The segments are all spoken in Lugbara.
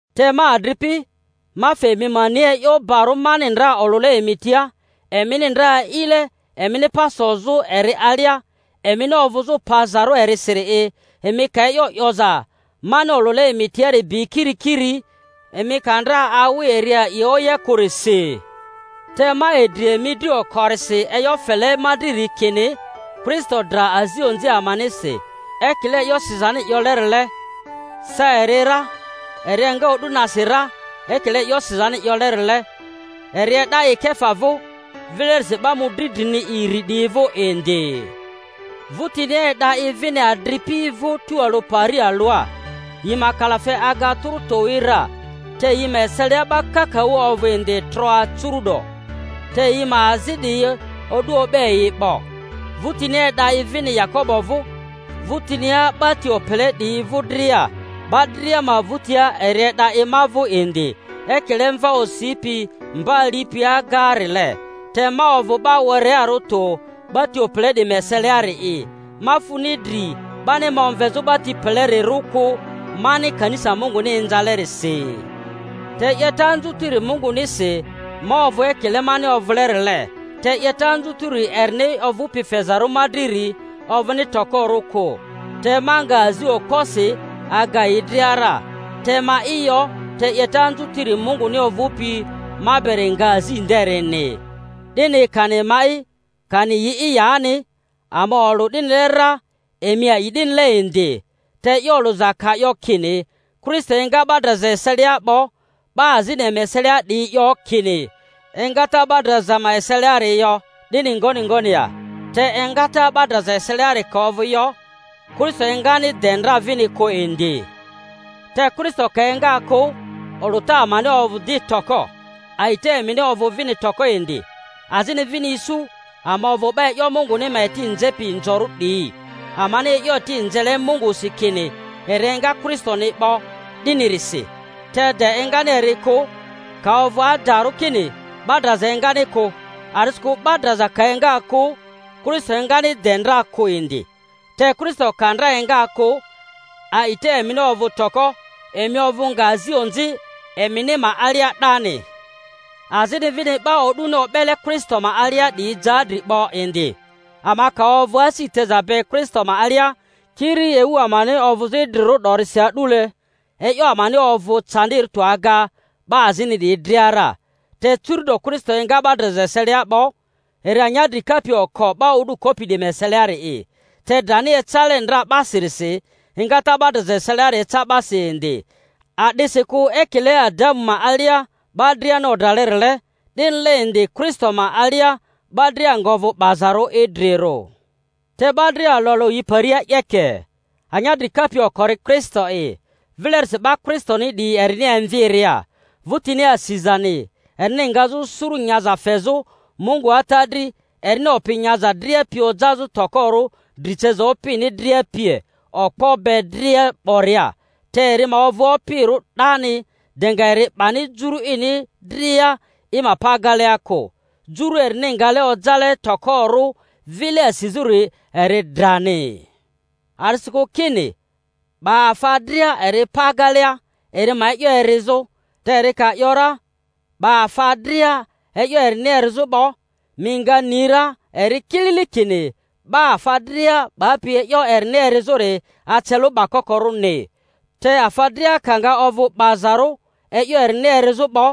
Te ma adripi, ma fe emi ma ni e'yo barᴜ mani ndra olᴜle emi tia, emini ndra a'ile, emini pa sozᴜ eri alia, emini ovᴜzᴜ pazarᴜ erisiri'i, emi ka e'yo 'yoza mani olᴜle emi tiari bi kirikiri—emi ka ndra awi eri a'i oye kᴜrisi. Te ma idri emi dri okorisi e'yo fele ma driri, kini Kristo dra azi onzi amanisi, ekile e'yo sizani 'yolerile, sa eri ra, eri enga o'du nasi ra ekile e'yo sizani 'yolerile, eri e'da i Kefa vᴜ, vilerisi 'ba mᴜdri drini iri 'diyi vᴜ indi. Vᴜtinia e'da i vini adripi vᴜ tualᴜ pari alᴜa, yi ma kalafe aga tᴜrᴜ towi ra, te yi ma eselia 'ba kakaᴜ ovᴜ indi troa curu'do, te yi ma azi 'diyi, o'du o'be yi 'bo. Vᴜrinia e'da i vini Yakobo vᴜ, vᴜtinia 'ba ti opele 'diyi vᴜdria. 'Ba dria ma vᴜtia eri e'da i ma vᴜ indi, ekile mva osipi mba alipi agaarile. Te ma ovᴜ 'ba werearᴜ tᴜ 'ba ti opele 'diyi ma eseliari'i, ma funi dri 'bani ma omvezᴜ 'ba ti pelerirᴜ kᴜ, mani kanisa Munguni inzalerisi. Te 'yeta anzutiri Mungunisi ma ovᴜ ekile mani ovᴜlerile, te 'yeta anzutiri erini ovᴜpi fezarᴜ ma driri ovᴜni tokorᴜ kᴜ. Te ma nga azi okposi aga yi dria ra, te ma'i yo, te 'yeta anzutiri Munguni ovᴜpi ma beri nga azi nderini. 'Dini kani ma'i, kani yi'i yani, ama olᴜ 'dinile ra, emi a'i 'dinile indi. Te e'yo olᴜza ka 'yo kini Kristo enga 'ba draza eselia 'bo, 'ba azini emi eselia 'diyi 'yo kini, Engata 'ba draza ma eseliari yo, 'dini ngoni ngoni ya? Te engata 'ba draza eseliari ka ovᴜ yo, Kristo engani de ndra vini kᴜ indi; te Kristo ka enga kᴜ, olᴜta amani ovᴜ di toko, a'ita emini ovᴜ vini toko indi. Azini vini isu ama ovᴜ 'ba e'yo Munguni ma eti nzepi inzorᴜ 'diyi, amani e'yo eti nzele Mungusi kini eri enga Kristoni 'bo, 'dinirisi, te de engani eri kᴜ, ka ovᴜ adarᴜ kini 'ba draza engani kᴜ. A'disikᴜ 'ba draza ka enga kᴜ, Kristo engani de ndra kᴜ indi. Te Kristo ka ndra enga kᴜ, a'ita emini ovᴜ toko, emi ovᴜ nga azi onzi emini ma alia 'dani. Azini vini 'ba o'duni o'bele Kristo ma alia 'diyi ja dri 'bo indi. Ama ka ovᴜ asi teza be Kristo ma alia kiri ewu amani ovᴜzᴜ idrirᴜ 'dorisi a'dule, e'yo amani ovᴜ candirᴜ tᴜ aga 'ba azini 'diyi dria ra. Te curu'do Kristo enga 'ba draza eselia 'bo, eri anyadri kapi oko 'ba o'du kopi 'diyi ma eseliari'i. Te drani ecale ndra 'basirisi, engata 'ba draza eseliari eca 'basi indi. A'disikᴜ ekile Adamu ma alia 'ba driani odralerile, 'dinile indi Kristo ma alia 'ba dria nga ovᴜ 'bazarᴜ idrirᴜ. Te 'ba dria alᴜ alᴜ yi paria 'yeke: anyadri kapi okori Kristo'i, vilerisi 'ba Kristoni 'diyi erini emviria. 'vᴜtinia asizani, erini ngazᴜ suru nyaza fezᴜ Mungu Ata dri, erini opi nyaza dria pi ojazᴜ tokorᴜ dri ceza opini dria pie, okpo be dria 'boria. Te eri ma ovᴜ opirᴜ 'dani, de nga eri 'bani juru ini dria i ma pa agelea kᴜ. Juru erini ngale ojale tokorᴜ vile asizᴜri eri drani. A'disikᴜ kini, 'Ba afa dria eri pa agelea, eri ma e'yo erizᴜ. Te eri ka ‘yora, 'Ba afa dria e'yo erini erizᴜ 'bo, mi nga ni ra eri kilili kini 'ba afa dria 'bapi e'yo erini erizᴜri ace lᴜ 'bakokorᴜni. Te afa dria ka nga ovᴜ 'bazarᴜ e'yo erini erizᴜ 'bo,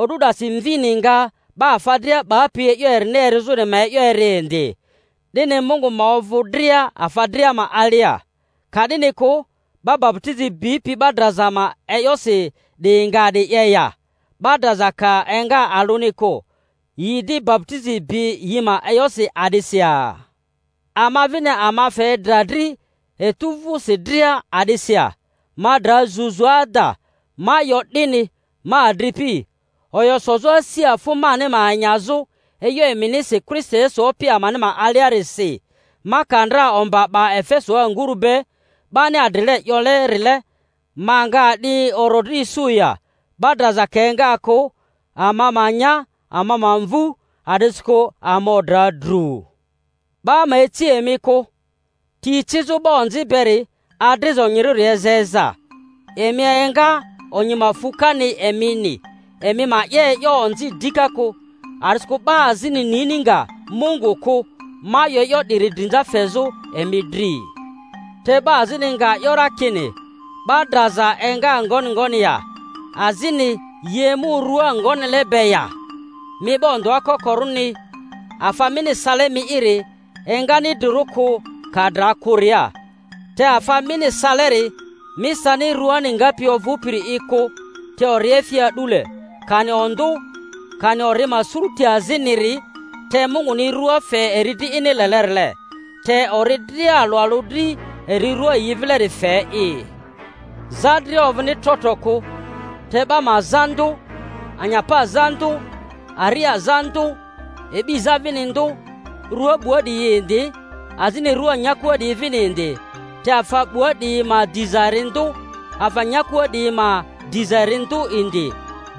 o'du 'dasi Mvini nga 'ba afa dria 'bapi e'yo erini erizᴜri ma e'yo eri indi, 'dini Mungu ma ovᴜ dria, afa dria ma alia. Ka 'dini kᴜ, 'ba baputizi bipi 'ba draza ma e'yosi 'diyi nga a'di 'ye ya? 'Ba draza ka enga alᴜni kᴜ, yi di baputizi bi yi ma e'yosi a'disi ya? Ama vini ama fe dra dri etu vᴜsi dria a'disi ya? Ma dra zuzu ada; ma 'yo 'dini, ma adripi, oyo sozᴜ asi afᴜ mani ma enyazᴜ e'yo eminisi Kristo Yesu Opi amani ma aliarisi! Ma ka ndra omba 'ba Efesoa nguru be, 'bani adrile 'yole-rile, ma nga a'di orodri isu ya? 'Ba draza ka enga kᴜ, ama ma nya, ama ma mvu, a'disikᴜ ama odra dru. 'Ba ma ici emi kᴜ: Ti ecizᴜ 'ba onzi beri adriza onyirᴜri eza eza. Emi enga, onyi ma fu kani emini, emi ma 'ye e'yo onzi dika kᴜ. A'disikᴜ 'ba azini nini nga Mungu kᴜ. Ma 'yo e'yo 'diri drinza fezᴜ emi dri. Te 'ba azini nga 'yo ra kini, 'Ba draza enga ngoni ngoni ya? Azini, Yi emu rua ngonile be ya? Mi 'ba ondᴜa kokorᴜni! Afa mini sale mi'iri engani idrirᴜ kᴜ, ka dra kᴜria. Te afa mini saleri, mi sani ruani ngapi ovᴜpiri'i kᴜ, te oriefi a'dule, kani ondᴜ, kani ori ma sururi aziniri. Te Munguni rua fe eri dri ini lelerile, te ori dria alᴜ alᴜ dri eri rua yi vileri fe'i. Za dria ovᴜni trotro kᴜ, te 'ba ma za ndᴜ, anyapa za ndᴜ, aria za ndᴜ, e'bi za vini ndᴜ. Rua 'bua 'diyi yi indi, azini rua nyakua 'diyi vini indi; te afa 'bua 'diyi ma diza eri ndᴜ, afa nyakua 'diyi ma diza eri ndᴜ indi.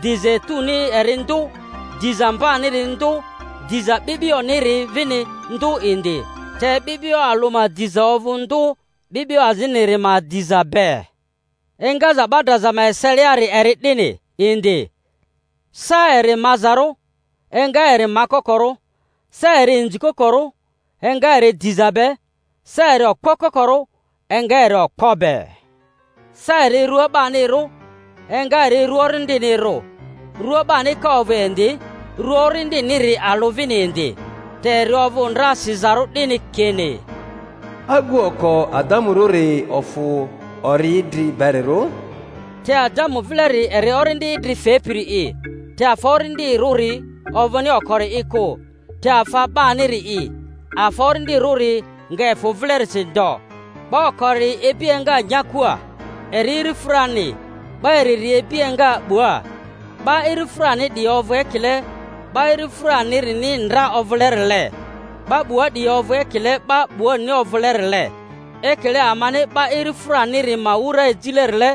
Diza etuni eri ndᴜ, diza mbaniri ndᴜ, diza 'bi'bioniri vini ndᴜ indi; te 'bi'bio alᴜ ma diza ovᴜ ndᴜ 'bi'bio aziniri ma diza be. Engaza 'ba draza ma eseliari eri 'dini indi. Sa eri mazarᴜ, enga eri makokorᴜ. Sa eri inzikokorᴜ, enga eri diza be. Sa eri okpo kokorᴜ, enga eri okpo be. Sa eri rua 'banirᴜ, enga eri rua orindinirᴜ. Rua 'bani ka ovᴜ indi, rua orindiniri alᴜ vini indi. Te eri ovᴜ ndra sizarᴜ 'dini kini, Agu oko Adamurᴜri ofᴜ ori idri berirᴜ; te Adamu vileri eri orindi idri fepiri'i. Te afa orindirᴜri ovᴜni okori'i kᴜ, te afa 'baniri'i; afa orindirᴜri nga efᴜ vilerisi ndo. 'Ba okori ibi enga nyakua, eri irifᴜrani; 'ba iriri ibi enga 'bua. 'Ba irifᴜrani 'diyi ovᴜ ekile 'ba irifᴜranirini ndra ovᴜlerile; 'ba 'bua 'diyi ovᴜ ekile 'ba 'buarini ovᴜlerile. Ekile amani 'ba irifᴜraniri ma wura ejilerile,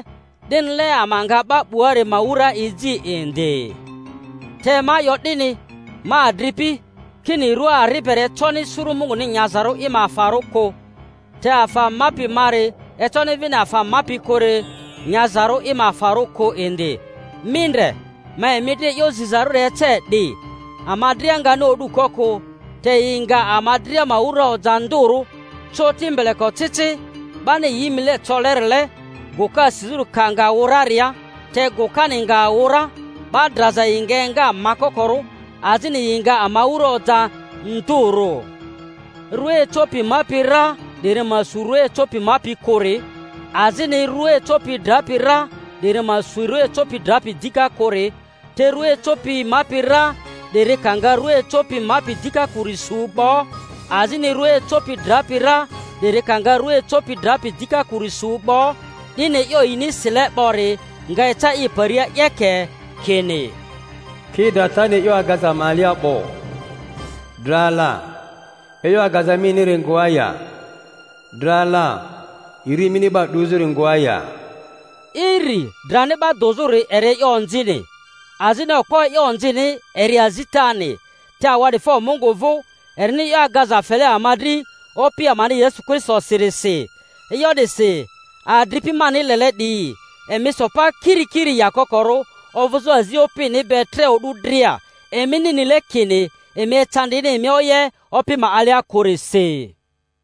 'dinile ama nga 'ba 'buari ma wura eji indi. Te ma 'yo 'dini, ma adripi, kini, rua ari beri econi suru Munguni nyazarᴜ i ma afarᴜ kᴜ, te afa mapi mari econi vini afa mapi kᴜri nyazarᴜ i ma afarᴜ kᴜ indi. Mi ndre! Ma emi dri e'yo zizarᴜri ece 'di. Ama dria ngani o'du ko kᴜ, te yi nga ama dria ma wura oja ndᴜrᴜ, coti mbelekocici, 'bani yi mile colerile, gᴜka asizᴜri ka nga wᴜ raria. Te gᴜkani nga wᴜ ra, 'ba draza yi nga enga makokorᴜ, azini yi nga ama wura oja ndᴜrᴜ. Rua ecopi mapi ra 'diri ma su rᴜa ecopi mapi kᴜri, azini rua ecopi drapi ra 'diri ma su rua ecopi drapi dika kᴜri. Te rua ecopi mapi ra 'diri ka nga rᴜa ecopi mapi dika kᴜri su 'bo, azini rᴜa ecopi drapi ra 'diri ka nga rua ecopi drapi dika kᴜri su 'bo, 'dini e'yo yini sile 'bori nga eca i paria 'yeke, kini: Ki dratani e'yo agaza ma alia 'bo. Dra la, e'yo agaza miniri ngoa ya? Dra la, iri mini 'ba dᴜzᴜri ngoa ya? Iri drani 'ba dᴜzᴜri eri e'yo onzini, azini okpo e'yo onzini eri azitani. Te awa'difo Mungu vᴜ, erini e'yo agaza fele ama dri Opi amani Yesu Kristosirisi. E'yo 'disi, adripi mani lele 'diyi, emi so pa kirikiri, yakokorᴜ, ovᴜzᴜ azi Opini be tre o'du dria, emini nile kini emi ecandini emi oye Opi ma alia kᴜrisi.